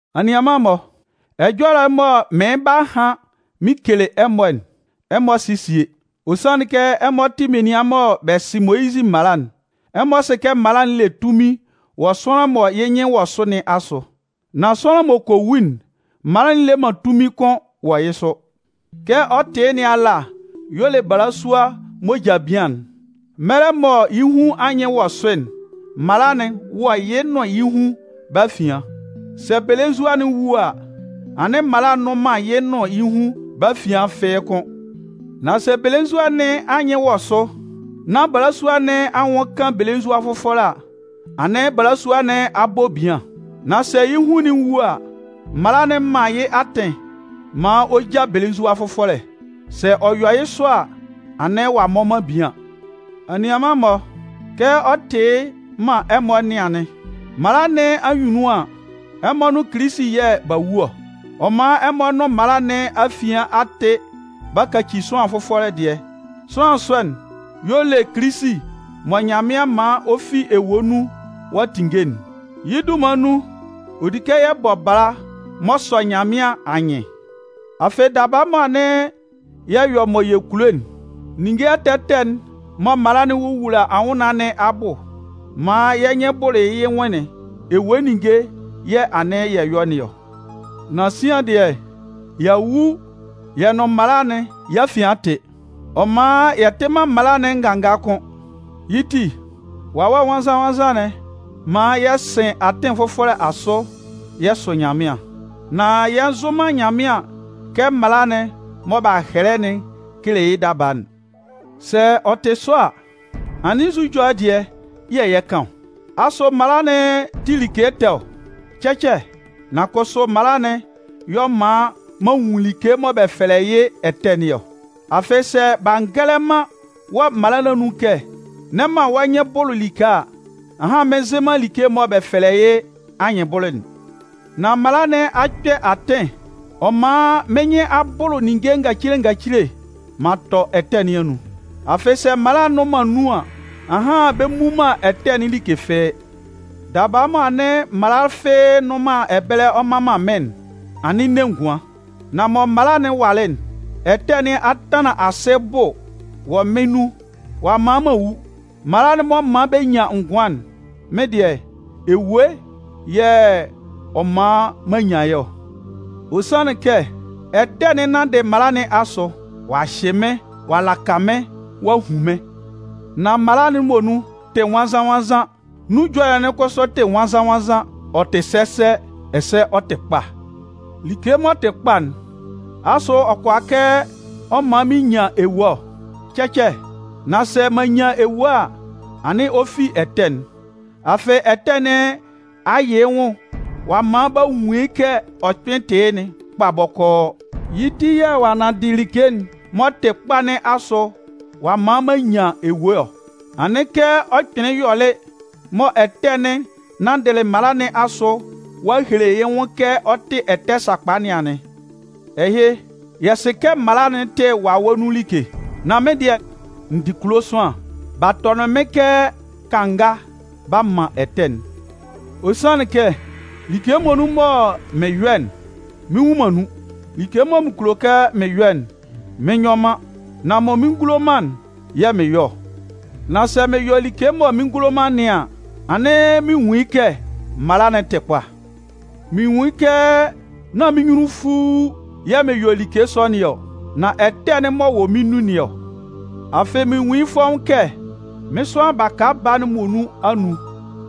Anianman-mɔ, ɛjɔlɛ'n mɔ mɩɩn 'ba han mɩn kele ɛmɔ'n, ɛmɔ sɩ sie. Ɔ sanlɩn kɛ, ɛmɔ tɩ menian mɔ bɛ sɩ Moyizɩ mala'n. Ɛmɔ sɩ kɛ mala'n le tunmin wɔ sʋanlan mɔ yɩ́ nyɩn wɔ sʋ nɩn asʋ. Nan sʋanlan m'ɔ kɔ wu'n, mala'n le man tunmin kʋ́n wɔ yɩ́ sʋ. Kɛ ɔ tɩ yɩ́ nɩn ala y'ɔ le balasua m'ɔ ja bian'n. Mɛlɛ mɔ yɩ́ hun anyɩn wɔ sʋ'n, mala'n wɔ yɩ́ nʋn yɩ́ hun bɛ́ afian. Sɛ belenzua'n wu a, anɩn mala nnʋn man yɩ́ nʋn yɩ́ hun bɛ́ afian fɩ́ɩ́ kʋ́n. Nan sɛ belenzua nɩn anyɩn wɔ sʋ, nán balasua nɩn anwʋn kan belenzua fʋfɔlɛ a, anɩn balasua nɩn a bɔ bian. Nan sɛ yɩ́ hun'n wu a, mala'n man yɩ́ atɩn maan ɔ ja belenzua fʋfɔlɛ. Sɛ ɔ yɔ yɩ́ sɔ a, anɩn ɔ'a mmɔ man bian. Anianman-mɔ, kɛ ɔ tɩ yɩ́ man ɛmɔ nɩn anɩn. Mala nɩn anyunnun an, ɛmɔ nʋn Kilisi yɛ̂ b'a wu ɔ. Ɔ man ɛmɔ nʋn mala nɩn afian a tɩ b'a kaci sʋanlan fɔfʋlɛ dɩɛ. Sʋanlan sɔ'n y'ɔ le Kilisi mɔ Nyanmɩan man ɔ fi ewue nun ɔ'a tinnge'n. Yɩ́ dunman nun, ɔ di kɛ yɛ bɔ bala m'ɔ sɔ Nyanmɩan anyɩn. Afɩ, daba mɔ anɩn yɛ yɔ mɔ yɛ kulo'n, ninnge ɛtɛ ɛtɛ'n mɔ mala'n wowula anwʋnnaan nɩn abʋ maan yɩ́ nyɩn bʋlʋ yɩ́ nwʋn'n, ewue ninnge yɛ̂ anɩn yɛ yɔ nɩn ɔ. Nan sian dɩɛ, y'a wu yɛ nʋn mala'n yɛ́ afian a tɩ. Ɔ man yɛ tɩ man mala'n nganga kʋ́n. Yɩ́ ti, Wawɛ Nwannzan-nwannzan'n man yɛ sɩn atɩn fʋfɔlɛ asʋ yɛ sʋ Nyanmɩan. Nan yɛ nzʋ man Nyanmɩan kɛ mala'n mɔ b'a hɛlɛ'n kele yɩ́ daba'n. Sɛ ɔ tɩ sɔ a, anɩn nzu ɛjɔlɛ dɩɛ yɛ̂ yɛ 'kan ɔ? Asʋ mala'n tɩ like ɛtɛ ɔ? Cɛcɛ! Nan kʋsʋ mala'n y'ɔ man m'an nwun like mɔ bɛ fɛlɛ yɩ́ ɛtɛ nɩn ɔ. Afɩ sɛ b'a ngɛlɛ man wɔ mala nɩn anun kɛ: N'ɛ man wɔ́ nyɩn bʋlʋ like a, ahan mɩn nzɩ man like'n mɔ bɛ fɛlɛ yɩ́ anyɩnbʋlʋ'n. Nan mala nɩn a kpɛ atɩn ɔ man mɩ́n nyɩn a bʋlʋ ninnge ngacile ngacile m'an tɔ ɛtɛ nɩn anun. Afɩ sɛ mala nnʋn man nun an, ahan bɛ mmu man ɛtɛ'n like fɩ́ɩ́. Daba mɔ anɩn mala fɩ́ɩ́ nnʋn man ɛbɛlɛ mman man mɩ́n'n, anɩn n ne ngʋan. Nan mɔ mala'n walɩ'n, ɛtɛ nɩn a tanlan asɩ bʋ wɔ mɩ́n nun ɔ'a man m'an wu. Mala'n m'ɔ man bɛ nyan ngʋan'n, mɩ́n dɩɛ, ewue yɛ̂ ɔ man m'an nyan yɩ́ ɔ. Ɔ sanlɩn kɛ, ɛtɛ'n nanndɩ mala nɩn asʋ ɔ'a hyɩ mɩ́n ɔ'a laka mɩ́n ɔ'a hun mɩ́n. Nan mala'n muonun tɩ nwannzan-nwannzan, nun ɛjɔlɛ'n kʋsʋ tɩ nwannzan-nwannzan, ɔ tɩ sɛsɛ ɛsɛ ɔ tɩ kpa. Like m'ɔ tɩ kpa'n, asʋ ɔ kʋalaa kɛ ɔ man mɩn nyan ewue ɔ? Cɛcɛ! Nan sɛ m'an nyan ewue a, anɩn ɔ fi ɛtɛ'n. Afɩ ɛtɛ nɩn a yɩ yɩ́ nwʋn ɔ'a man b'a nwun kɛ ɔ kpɩn tɩ yɩ́'n kpa bɔkɔɔ. Yɩ́ ti yɛ̂ ɔ'a nanndɩ like'n m'ɔ tɩ kpa nɩn asʋ ɔ'a man m'an nyan ewue ɔ. Anɩn kɛ ɔ kpɩnlɩn yɔlɩ mɔ ɛtɛ'n nanndɩ mala nɩn asʋ ɔ'a hele yɩ́ nwʋn kɛ ɔ tɩ ɛtɛ sakpa nɩn anɩn. Ɛhɩ, yɛ sɩ kɛ mala'n tɩ Wawɛ nun like. Nan mɩ́n dɩɛ, n dɩ kulo sʋanlan, b'a tɔnɩn mɩ́n kɛ kanga b'a man ɛtɛ'n. Ɔ sanlɩn kɛ like muonun mɔ mɩn yɔ'n, mɩn nnwun man nun. Like mɔ mɩn kulo kɛ mɩn yɔ'n, mɩn nyɔ man, nan mɔ mɩn ngulo man'n, yɛ̂ mɩn yɔ ɔ. Nan sɛ mɩn yɔ like mɔ mɩn ngulo man nɩn an, anɩn mɩn nwun yɩ́ kɛ mala'n tɩ kpa. Mɩn nwun yɩ́ kɛ nán mɩ́n nyunnunfuu yɛ̂ mɩn yɔ like sɔ nɩn ɔ, nan ɛtɛ'n m'ɔ wɔ mɩ́n nun nɩn ɔ. Afɩ mɩn nwun yɩ́ fɔ́ʋ́n kɛ mɩ́n sʋanlan baka baa'n muonun anun,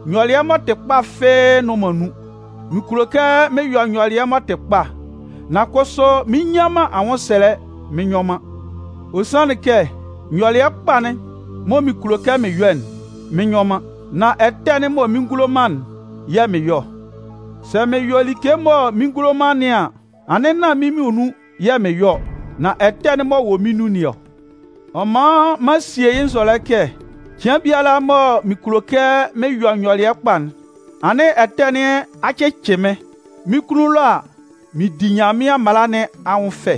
nyɔlɩɛ m'ɔ tɩ kpa fɩ́ɩ́ nnʋn man nun. Mɩn kulo kɛ mɩn yɔ nyɔlɩɛ m'ɔ tɩ kpa, nan kʋsʋ mɩn nnyan man anwʋnsɛlɛ mɩn nyɔ man. Ɔ sanlɩn kɛ, nyɔlɩɛ kpa'n mɔ mɩn kulo kɛ mɩn yɔ'n, mɩn nyɔ man. Nan ɛtɛ'n mɔ mɩn ngulo man'n yɛ̂ mɩn yɔ ɔ. Sɛ mɩn yɔ like mɔ mɩn ngulo man nɩn an, anɩn nán mɩ́n muonun yɛ̂ mɩn yɔ ɔ, nan ɛtɛ'n m'ɔ wɔ mɩ́n nun nɩn ɔ. Ɔ man m'an sie yɩ́ nzɔlɛ kɛ cɩan biala mɔ mɩn kulo kɛ mɩn yɔ nyɔlɩɛ kpa'n, anɩn ɛtɛ nɩn a cɩcɩ mɩ́n. Mɩ́n kunnun ɛlɔ a, mɩn di Nyanmɩan mala nɩn anwʋn fɛ.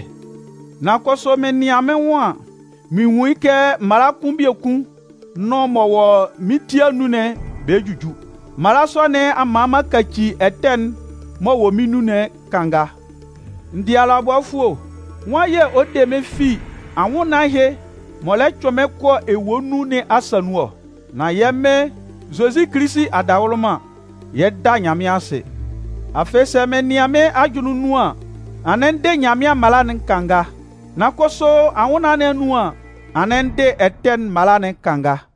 Nan kʋsʋ mɩn nɩan mɩ́n nwʋn an, mɩn nwun yɩ́ kɛ mala kʋn biekun nʋn m'ɔ wɔ mɩ́n ti anun'n bɛ juju. Mala sɔ nɩn a man m'an kaci ɛtɛ'n m'ɔ wɔ mɩ́n nun'n kanga. N dɩ alʋabɔfʋɛ o! Nwan yɛ̂ ɔ 'de mɩ́n fi anwʋnnaan ɛhɩ m'ɔ lɛ cʋɩn mɩ́n kɔ ewue nun nɩn asa nun ɔ? Nan yɛ́ Mɩn Zozi Kilisi adawʋlʋman, yɛ 'da Nyanmɩan asɩ! Afɩ, sɛ mɩn nɩan mɩ́n ajʋnlɩn nɩn anun an, anɩn n dɩ Nyanmɩan mala'n kanga. Nan kʋsʋ anwʋnnaan nɩn anun an, anɩn ndɩ ɛtɛ'n mala'n kanga.